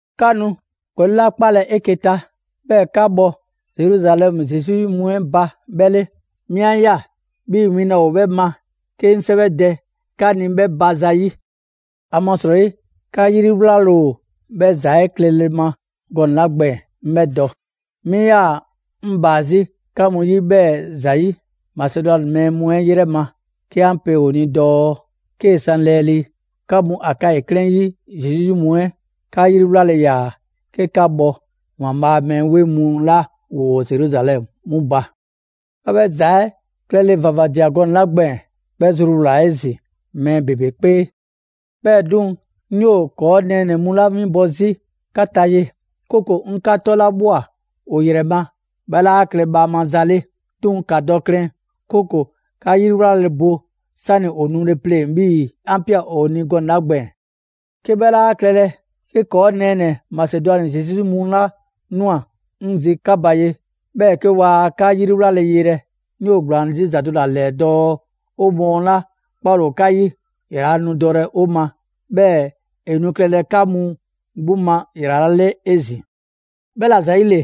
'Ka nu ‑gɔli' 'la 'kpalɛ‑ 'eke‑ ta, 'bhɛɛ‑ 'ka bhɔ Zeruzalɛmu Zesu 'yi mu 'ɛ ba 'bhɛ 'le, 'mi 'a ꞊ya 'bhii‑ win laa ‑o 'bhɛ ma 'ke 'ŋ 'sɛwɛdɛ 'ka ni 'bhɛ ba ‑zayi'. ‑Amasrɔyi 'ka 'yriwlale ‑o 'bhɛ ‑za 'ɛ klɛle ma gɔnɛ‑ 'la gbɛɛn‑, 'ŋ 'bhɛ dɔ. 'Mi 'yaa‑ 'ŋ ‑baa 'zi 'ka mu 'yi 'bhɛɛ‑ ‑zayi' Masedwani mɛɛ mu 'ɛ 'yrɛ ma 'ke 'an pe ‑o ni dɔɔ: «'Kee‑ san lɛɛlii, 'ka mu Akayi 'klɛɛn 'yi Zesu 'yi mu 'ɛ, 'ka 'yriwlale ‑yaa 'ke 'ka bhɔ ‑Waanbhaa' a mɛɛ 'weŋ mu 'la ‑woo Zeruzalɛmu 'mu ba.» 'Ka 'bhɛ ‑za 'ɛ klɛle ‑vavadia gɔnɛ‑ 'la gbɛɛn‑, 'bhɛ zruwlaa‑ 'ezin‑ mɛɛ ‑bebe 'kpee. 'Bhɛɛ‑ 'duŋ‑, 'ŋ 'yoo‑ ‑kɔɔ' nɛɛnɛ‑ mu 'la 'winbɔ‑ 'zi 'ka ta ye, 'kooko‑ 'ŋ 'ka 'tɔlabhwa ‑o ‑yrɛ ma, 'bhɛ 'laa klɛ bhaama za 'le. 'Duŋ‑ ‑ka dɔ klɛn, 'kooko‑ 'ka 'yriwlale bo 'sani‑ ‑o nule pleŋ‑ 'bhii‑ 'an ꞊pia ‑o ni gɔnɛ‑ 'la gbɛɛn‑. 'Ke 'bhɛ 'laa klɛlɛ, 'ke ‑kɔɔ' nɛɛnɛ‑ Masedwani Zesu 'yi mu 'la ꞊nwa 'ŋ zi 'ka ba ye, 'bhɛɛ‑ 'ke waa 'ka 'yriwlale yelɛ, 'ŋ 'yoo‑ ‑gblaan 'zi ‑za do ‑la ‑lɛɛ dɔɔ 'o mɔɔ 'la 'kpale‑ ‑o 'ka 'yi, ‑yrala' nu dɔlɛ 'o ma, 'bhɛɛ‑ ‑e nu klɛlɛ 'ka mu 'gbu ma ‑yrala' 'le 'ezin‑. 'Bhɛla‑ ‑zayile,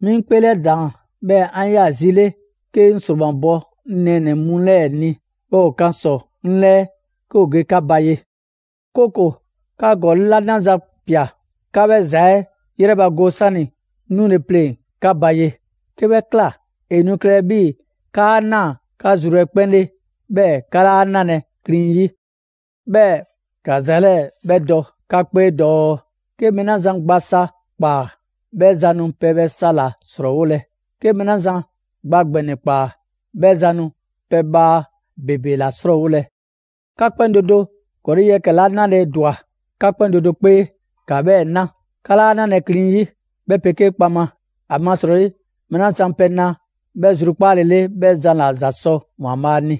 'mi 'ŋ 'kpeelɛdaan, 'bhɛɛ‑ 'an ꞊ya zi 'le 'ke 'ŋ ‑sromabɔ 'ŋ nɛɛnɛ‑ mu 'lɛɛ‑ ni, 'bhɛɛ‑ ‑o kan ‑sɔ 'ŋ 'lɛɛ 'ke ‑o ge 'ka ba ye; 'kooko‑ 'ka ‑gɔli' 'la 'naza‑ ꞊pia, 'ka 'bhɛ ‑za 'ɛ 'yrɛbago 'sani‑ 'ŋ 'nule‑ pleŋ‑ 'ka ba ye. 'Ke 'bhɛ ꞊kla, ‑e nu klɛlɛ 'bhii‑ 'kaa ꞊naa 'ka zru 'ɛ 'kpɛn 'le, 'bhɛɛ‑ 'ka 'laa 'nalɛ‑ 'klin 'yi. 'Bhɛɛ‑ ‑ka ‑za 'lɛɛ‑ 'bhɛ dɔ 'ka 'kpee dɔɔ: 'Ke mɛɛ 'la zan gba sa ꞊kpaa, 'bhɛ zan nu pɛbhaa sa ‑la ‑srɔɔwolɛ. 'Ke mɛɛ 'la zan gba ‑gbɛnɛ ꞊kpaa, 'bhɛ zan nu pɛbhaa ‑bebe ‑la 'srɔɔwolɛ. 'Ka 'kpɛn do do ‑gɔli' yɛkɛ‑ 'la 'nale‑ ‑dwa 'ka 'kpɛn do do 'kpee, ‑ka 'bhɛɛ‑ 'na. 'Ka 'laa 'nalɛ klin 'yi, 'bhɛ 'pegee kpaŋma. ‑Amasrɔyi mɛɛ 'la zan pɛ na 'bhɛ zrukpaale 'le, 'bhɛ zan ‑la ‑za sɔ ‑Waanbhaa' ni.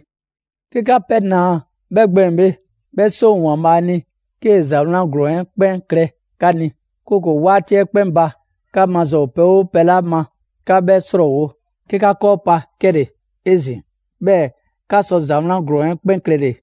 'Ke 'ka pɛ ‑naa 'bhɛ gbɛɛn‑ bhe, 'bhɛ 'seŋ ‑o ‑Waanbhaa' ni 'kee‑ ‑za 'wlan ‑glɔɔn 'ɛ 'kpɛn klɛ 'ka ni, 'kooko‑ 'waati 'ɛ 'kpɛn ba 'ka maza ‑o pɛ 'oo pɛ 'la ma 'ka 'bhɛ 'srɔɔwo‑, 'ke 'ka 'kɔɔ pa 'kɛle‑ 'ezin‑, 'bhɛɛ‑ 'ka sɔ ‑za 'wlan ‑glɔɔn 'ɛ 'kpɛn klɛle‑.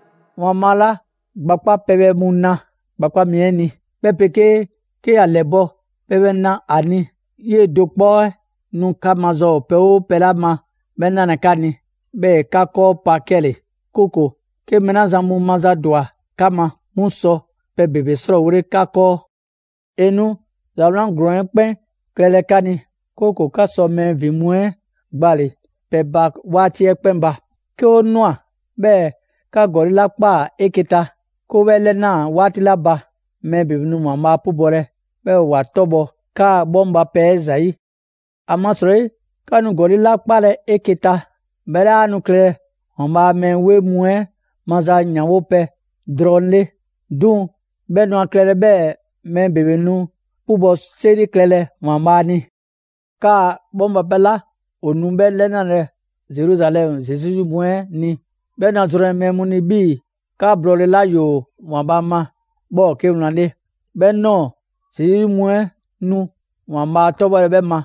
‑Waanbhaa' 'la gba 'kpa pɛbhɛ mu na gba 'kpa mi 'ɛ ni, 'bhɛ 'pegee 'ke ‑ya ‑lɛbɔ' pɛbhle na ‑a ni, 'yee‑ do 'kpɔ 'ɛ nu 'ka maza ‑o pɛ 'oo pɛ 'la ma 'bhɛ 'nalɛ‑ 'ka ni, 'bhɛɛ‑ ‑e 'ka 'kɔɔ pa 'kɛle‑, 'kooko‑ 'ke mɛɛ 'la zan mu mazadwa 'ka ma, 'mu sɔ pɛ ‑bebe 'srɔɔwole 'ka 'kɔɔ. ‑E nu ‑za 'wlan ‑glɔɔn 'ɛ 'kpɛn klɛlɛ 'ka ni, 'kooko‑ 'ka sɔ mɛɛ ‑vin mu 'ɛ gbale‑ pɛ ba 'waati 'ɛ 'kpɛn ba. 'Ke 'o ꞊nwa, 'bhɛɛ‑ 'ka ‑gɔli' 'la ꞊kpaa 'eke‑ ta, 'ke 'o 'bhɛ 'lɛnaa‑ 'waati 'la ba, mɛɛ ‑bebe nu ‑Waanbhaa' 'pubɔlɛ, 'bhɛɛ‑ ‑wa 'tɔbhɔ‑ 'kaa‑ 'bhɔŋbapɛ 'ɛ ‑zayi'. ‑Amasrɔyi 'ka nu ‑gɔli' 'la 'kpalɛ‑ 'eke‑ ta, 'bhɛ 'laa nu klɛlɛ ‑Waanbhaa' a mɛɛ 'weŋ mu 'ɛ maza ‑yanwopɛ drɔŋ 'le; 'duŋ‑ 'bhɛ nu ‑a klɛlɛ 'bhɛɛ‑ mɛɛ ‑bebe nu 'pubɔ‑ 'seri klɛlɛ ‑Waanbhaa' ni. 'Kaa‑ 'bhɔŋbapɛ 'la 'o nu 'bhɛ 'lɛnalɛ Zeruzalɛmu Zesu 'yi mu 'ɛ ni, 'bhɛ nu a zrɔnlɛ mɛɛ mu ni 'bhii‑ 'ka blɔɔle 'la ‑yoo ‑Waanbhaa' ma 'bhɛ ‑o 'ke wlan 'le. 'Bhɛ ꞊nɔɔ Zesu 'yi mu 'ɛ nu ‑Waanbhaa' 'tɔbhɔlɛ 'bhɛ ma,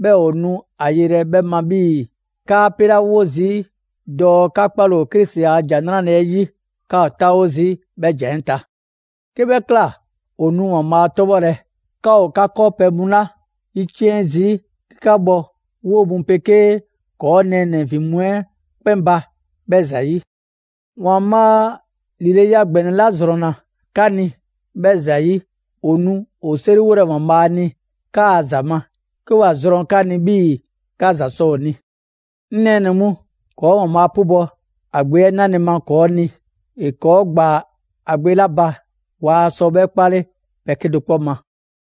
'bhɛɛ‑ ‑o nu a yelɛ 'bhɛ ma 'bhii‑ 'kaa‑ pelawo zii' dɔɔ 'ka 'kpale‑ ‑o Krisi a ‑Jan 'Nrale‑ 'ɛ 'yi, 'ka ‑o 'taawo zii' 'bhɛ ‑jan 'ɛ ta. 'Ke 'bhɛ ꞊kla, ‑o nu ‑Waanbhaa' 'tɔbhɔlɛ, 'ka ‑o 'ka 'kɔɔpɛ‑ mu 'la 'yiciɛn‑ zii' 'ke 'ka bhɔ 'woo‑ mu 'pegee ‑kɔɔ' nɛɛnɛ‑ ‑vin mu 'ɛ 'kpɛn ba 'bhɛ ‑zayi'. ‑Waanbhaa' ‑lileya ‑gbɛnɛ 'la ‑zrɔnna 'ka ni, 'bhɛ ‑zayi', ‑o nu ‑o 'seriwolɛ ‑Waanbhaa' ni 'kaa‑ ‑za ma 'ke ‑wa zrɔn 'ka ni 'bhii‑ 'ka ‑za sɔ ‑o ni. 'Ŋ nɛɛnɛ‑ mu, ‑kɔɔ' ‑Waanbhaa' 'pubɔ‑ ‑a Gbe 'ɛ 'nale‑ ma ‑kɔɔ' ni! ‑E 'kɔɔ‑ ‑gbaa ‑a Gbe 'la ba, waa sɔ 'bhɛ 'kpale pɛ 'kedo‑ 'kpɔ ma.